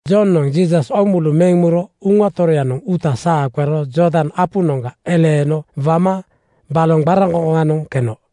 Jonoŋ Jiisas oomulu meŋ muro Uŋa Toroyanoŋ uuta saa qero Jordan apunoŋga eleeno wama baloŋ qararaŋkoŋkoŋanoŋ keno.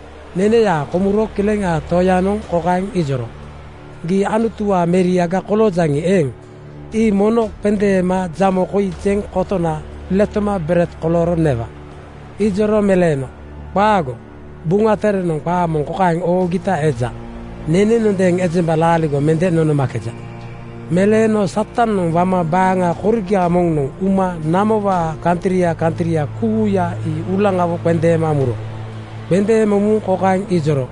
Neneyaa komuro Kileŋaa Toyanoŋ kokaeŋ ijoro, “Gii Anutuwaa meriaga koloojaŋi eeŋ, ii mono qendeema jamo koi jeŋ kotona letoma bered kolooro newa.” Ijoro meleeno, “Qaago! Buŋa Terenoŋ qaa kokaeŋ oogita eja, ‘Nenenondeeŋ ejemba laaligo mende nonomakeja.’” Meleeno Satanoŋ wama baaŋa koriga moŋnoŋ uma namowaa kantria kantria kuuya ii uulaŋawo qendeema muro. Qendeema muŋ kokaeŋ ijoro,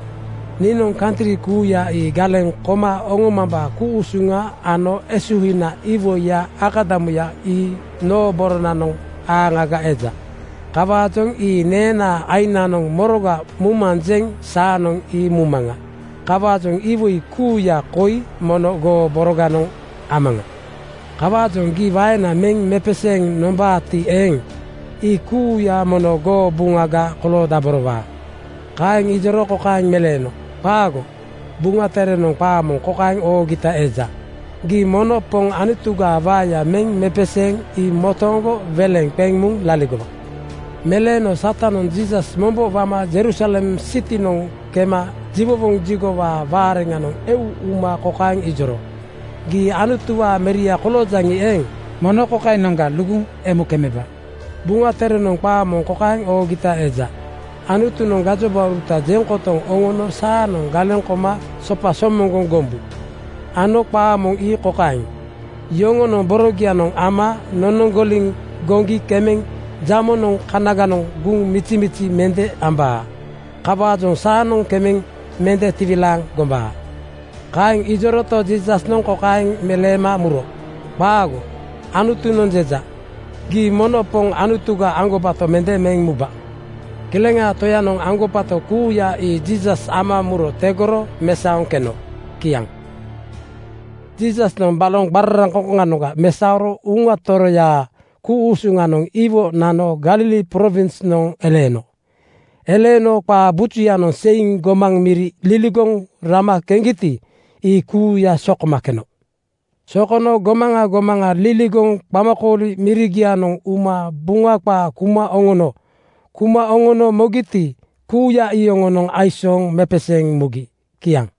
“Niinoŋ kantri kuuya ii galeŋ koma oŋomambaa ku-usuŋa ano esuhina iwoiyaa akadamuya ii noo boronanoŋ aaŋaga eja. Kawaajoŋ ii neenaa aiŋnaanoŋ moroga mumanjeŋ saanoŋ ii mumaŋa. Kawaajoŋ iwoi kuuya koi mono goo boroganoŋ amaŋa. Kawaajoŋ gii waena meŋ mepeseeŋ nombaati eeŋ, ii kuuya mono goo buŋaga koloodaborowaa.” Kaeŋ ijoro kokaeŋ meleeno, “Qaago! Buŋa Terenoŋ qaa kokaeŋ oogita eja, ‘Gii mono Poŋ Anutugaa waeya meŋ mepeseeŋ ii motooŋgo weleŋ qeŋ muŋ laligowa.’” Meleeno Satanoŋ Jiisas mombo wama Jerusalem sitinoŋ kema jiwowoŋ jigowaa waareŋanoŋ eu uma kokaeŋ ijoro, “Gii Anutuwaa meria koloojaŋi eeŋ, mono kokainoŋga luguŋ emu kemeba. Buŋa Terenoŋ qaa moŋ kokaeŋ oogita eja, ‘Anutunoŋ gajobauruta jeŋ kotoŋ oŋono saanoŋ galeŋ koma sopa somoŋgoŋ gombu,’ ano qaa moŋ ii kokaeŋ, ‘Yoŋonoŋ borogianoŋ ama nonoŋgoliŋ goŋgi kemeŋ jamonoŋ kanaganoŋ guŋ mijimiji mende ambaa.’” Kawaajoŋ saanoŋ kemeŋ mende tiwilaaŋ gombaa. Kaeŋ ijoroto, Jiisasnoŋ kokaeŋ meleema muro, “Qaago! Anutunoŋ jeja, ‘Gii mono Poŋ Anutuga aŋgobato mende meŋ muba.’” Kileŋaa Toyanoŋ aŋgobato kuuya ii Jiisas ama muro tegoro mesaoŋ keno. Kiaŋ. Jiisasnoŋ baloŋ qararaŋkoŋkoŋa mesaoro Uŋa Toroyaa ku-usuŋanoŋ iwo nano Galili prowinsnoŋ eleeno. Eleeno qaa bujuyanoŋ seiŋ gomaŋ miri liligoŋ rama keŋgiti, ii kuuya sokoma keno. Sokono gomaŋa gomaŋa liligoŋ qamakooli mirigianoŋ uma Buŋa qaa kuma oŋono. Kuma oŋono mogiti, kuuya iyoŋonoŋ aisooŋ mepeseeŋ mugi. Kiaŋ.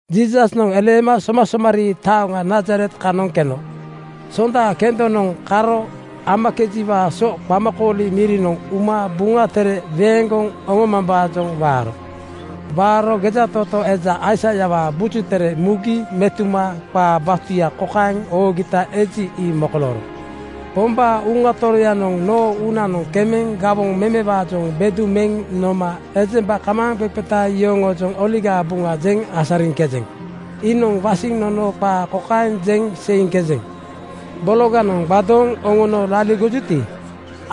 Jiisasnoŋ eleema somasomarii taoŋa Nazaret kanoŋ keno. Sonda kendonoŋ karo amakejiwaa so qamakooli mirinoŋ uma Buŋa Tere weeŋgoŋ oŋomambaajoŋ waaro. Waaro gejatootoo eja Aisaiawaa Buju Tere mugi metuma qaa batuya kokaeŋ oogita eji, ii mokolooro: “Pombaa Uŋa Toroyanoŋ noo uunanoŋ kemeŋ gawoŋ memewaajoŋ bedu meŋ noma ejemba kamaaŋqeqeta yoŋoojoŋ Oligaa Buŋa jeŋ asariŋkejeŋ. Iinoŋ wasiŋ nono qaa kokaeŋ jeŋ seiŋkejeŋ: Bologanoŋ gbadooŋ oŋono laligojuti,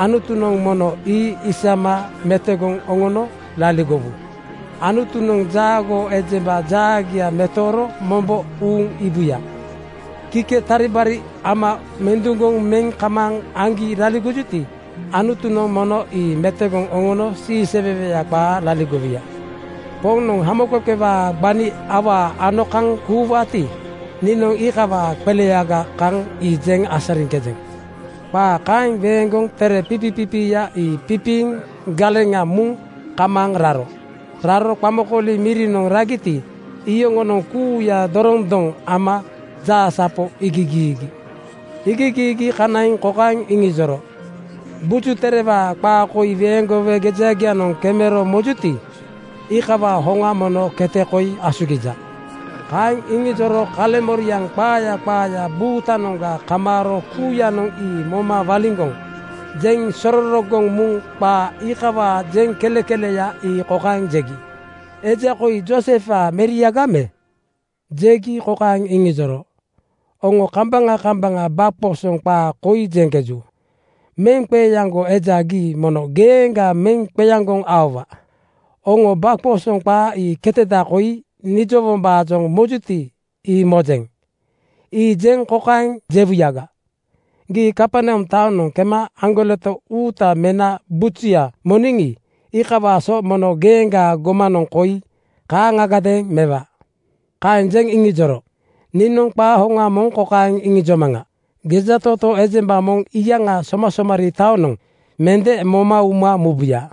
Anutunoŋ mono ii isama metogoŋ oŋono laligowu. Anutunoŋ jaagoo ejemba jaagia metooro mombo uuŋ iibuya. Kike taribari ama menduŋgoŋ meŋ kamaaŋ aŋgi laligojuti, Anutunoŋ mono ii metogoŋ oŋono siiseweweya qaa laligowuya. Poŋnoŋ hamoqeqewaa gbani awaa ano kaŋ kuuwaati, niinoŋ iikawaa qeleyaga kaŋ ii jeŋ asariŋkejeŋ.” Qaa kaeŋ weeŋgoŋ tere pipipipiiya ii pipiiŋ galeŋa muŋ kamaaŋ raro. Raro qamakooli mirinoŋ ragiti, iyoŋonoŋ kuuya dorondoŋ ama jaasapo iigigiigi. Iigigiigi kanaiŋ kokaeŋ iŋijoro, “Buju Terewaa qaa koi weeŋgowe gejagianoŋ kemero mojuti, iikawaa hoŋa mono kete koi asugija.” Kaeŋ iŋijoro kaleŋmoriaŋ qaaya qaaya buutanoŋga kamaaro kuuyanoŋ ii moma waliŋgoŋ jeŋ sororogoŋ muŋ qaa iikawaa jeŋkelekeleya ii kokaeŋ jegi, “Eja koi Joosefwaa meriaga me?” Jegi kokaeŋ iŋijoro, “Oŋo kambaŋa kambaŋa gbaqoosoŋ qaa koi jeŋkeju, ‘Meŋqeeaŋgo eja gii mono geeŋga meŋ qeaŋgoŋ aowa.’ Oŋo gbaqoosoŋ qaa ii keteda koi nijowombaajoŋ mojuti, ii mojeŋ. Ii jeŋ kokaeŋ jewuyaga, ‘Gii Kaperneam taonoŋ kema aŋgoleto uuta mena bujuya moniŋi, iikawaa so mono geeŋgaa gomanoŋ koi kaaŋagadeeŋ mewa.’” Kaeŋ jeŋ iŋijoro, “Niinoŋ qaa hoŋa moŋ kokaeŋ iŋijomaŋa: Gejatootoo ejemba moŋ iyaŋaa somasomarii taonoŋ mende moma uma mubuya.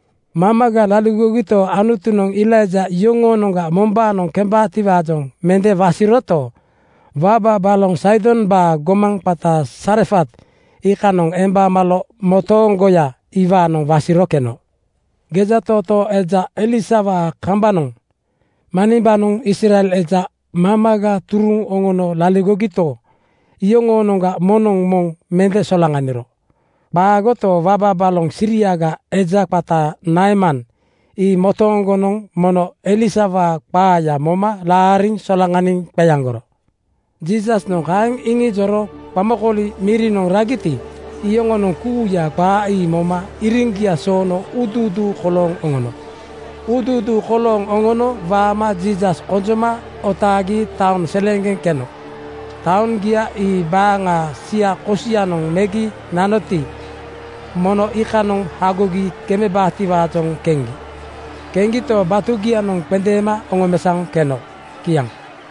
Mamaga laligogito, Anutunoŋ Elaija yoŋoonoŋga mombaanoŋ kembaatiwaajoŋ mende wasiroto, waba baloŋ Saidombaa gomaŋ qata Sarefat iikanoŋ emba malo motooŋgoya iwaanoŋ wasiro keno. Gejatootoo eja Elisawaa kambanoŋ manimbanoŋ Israel eja mamaga turuŋ oŋono laligogito, iyoŋoonoŋga moŋnoŋ moŋ mende solaŋaniro. Qaagoto, waba baloŋ Siriaga eja qata Naeman ii motooŋgonoŋ mono Elisawaa qaaya moma laariŋ solaŋaniŋ qeaŋgoro.” Jiisasnoŋ kaeŋ iŋijoro qamakooli mirinoŋ ragiti, iyoŋonoŋ kuuya qaa ii moma iriŋgia soono uuduuduu kolooŋ oŋono. Uuduuduu kolooŋ oŋono waama Jiisas konjoma otaagi taoŋ seleeŋgeŋ keno. Taoŋgia ii baaŋaa sia kosianoŋ megi nanoti, mono iikanoŋ hagogi kemebaatiwaajoŋ keŋgi. Keŋgito, batugianoŋ qendeema oŋomesaoŋ keno. Kiaŋ.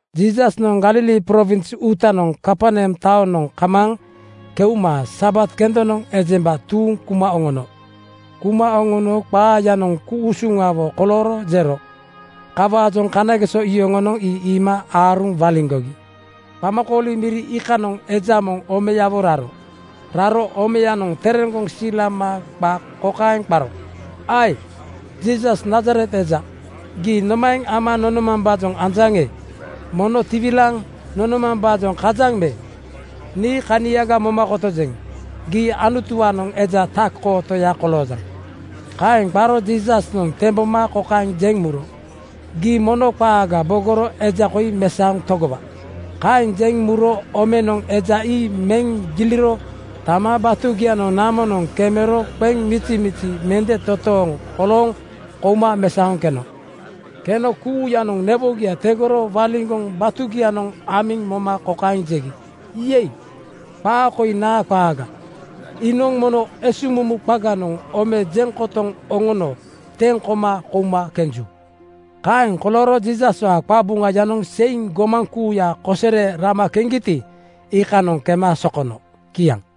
Jiisasnoŋ Galili prowins uutanoŋ Kaperneam taonoŋ kamaaŋ keuma Sabat kendonoŋ ejemba tuuŋ kuma oŋono. Kuma oŋono qaayanoŋ ku-usuŋawo kolooro jero. Kawaajoŋ kanageso yoŋonoŋ ii iima aaruŋ waliŋgogi. Qamakooli miri iikanoŋ eja moŋ omeyawo raro. Raro omeyanoŋ tereŋgoŋ silama qa kokaeŋ qaro, “Ae! Jiisas, Nazaret eja! Gii nomaeŋ ama nonomambaajoŋ anjaŋe? Mono tiwilaaŋ nonomambaajoŋ kajaŋ me? Nii kaniaga moma kotojeŋ. Gii Anutuwaanoŋ eja Tak-kootoya koloojaŋ.” Kaeŋ qaro Jiisasnoŋ temboma kokaeŋ jeŋ muro, “Gii mono qaaga bogoro eja koi mesaoŋ togowa.” Kaeŋ jeŋ muro omenoŋ eja ii meŋ giliro tama batugianoŋ namonoŋ kemero qeŋ mizimizi mende totooŋ kolooŋ kouma mesaoŋ keno. Keno kuuyanoŋ newogia tegoro waliŋgoŋ batugianoŋ amiŋ moma kokaeŋ jegi, “Yei! Qaa koi naa qaaga? Iinoŋ mono esuŋmumu qaganoŋ ome jeŋ kotoŋ oŋono teŋ koma kouma kenju.” Kaeŋ kolooro Jiisaswaa qabuŋayanoŋ seiŋ gomaŋ kuuya kosere rama keŋgiti, iikanoŋ kema sokono. Kiaŋ.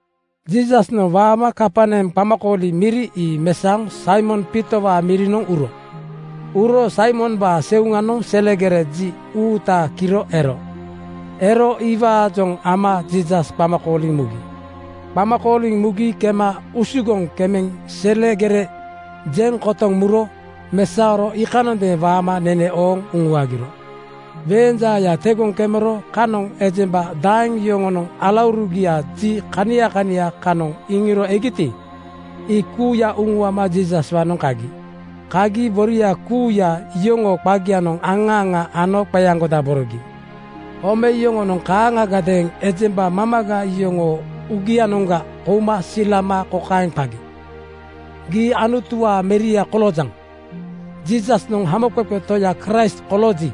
Jiisasnoŋ waama Kaperneam qamakooli miri ii mesaoŋ Saimon Piitowaa mirinoŋ uro. Uro Saimombaa seuŋanoŋ selegere ji uuta kiro ero. Ero iwaajoŋ ama Jiisas qama kooliŋ mugi. Qama kooliŋ mugi kema usugoŋ kemeŋ selegere jeŋ kotoŋ muro mesaoro iikanondeeŋ waama nene ooŋ uŋuagiro. Weeŋ jaaya tegoŋ kemero kanoŋ ejemba daeŋ yoŋonoŋ alaurugia ji kania kania kanoŋ iŋiro egiti, ii kuuya uŋuama Jiisaswaanoŋ kagi. Kagi boria kuuya yoŋoo qagianoŋ aŋa aŋa ano qeaŋgodaborogi. Ome yoŋonoŋ kaaŋagadeeŋ ejemba mamaga yoŋoo uugianoŋga kouma silama kokaeŋ qagi, “Gii Anutuwaa meria koloojaŋ.” Jiisasnoŋ Hamoqeqe Toya Kraist kolooji,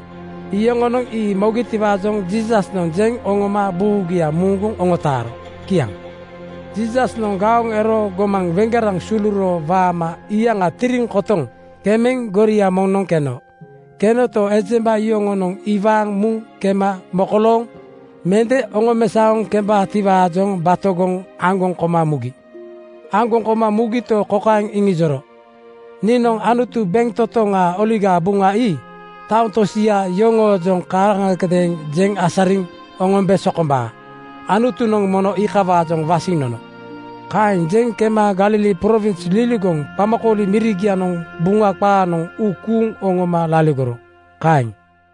iyoŋonoŋ ii mogitiwaajoŋ Jiisasnoŋ jeŋ oŋoma buugia muuŋguŋ oŋotaaro. Kiaŋ. Jiisasnoŋ gaoŋ ero gomaŋ weŋgeraŋ suluro waama iyaŋa tiriŋ kotoŋ kemeŋ goria moŋnoŋ keno. Kenoto, ejemba yoŋonoŋ iwaaŋ muŋ kema mokolooŋ mende oŋomesaoŋ kembaatiwaajoŋ batogoŋ aŋgoŋ koma mugi. Aŋgoŋ koma mugito, kokaeŋ iŋijoro, “Niinoŋ Anutu bentotoŋaa Oligaa Buŋa ii taoŋ tosia yoŋoojoŋ kaaŋagadeeŋ jeŋ asariŋ oŋombe sokombaa. Anutunoŋ mono iikawaajoŋ wasiŋ nono.” Kaeŋ jeŋ kema Galili prowins liligoŋ qamakooli mirigianoŋ Buŋa qaanoŋ uu kuuŋ oŋoma laligoro. Kaeŋ.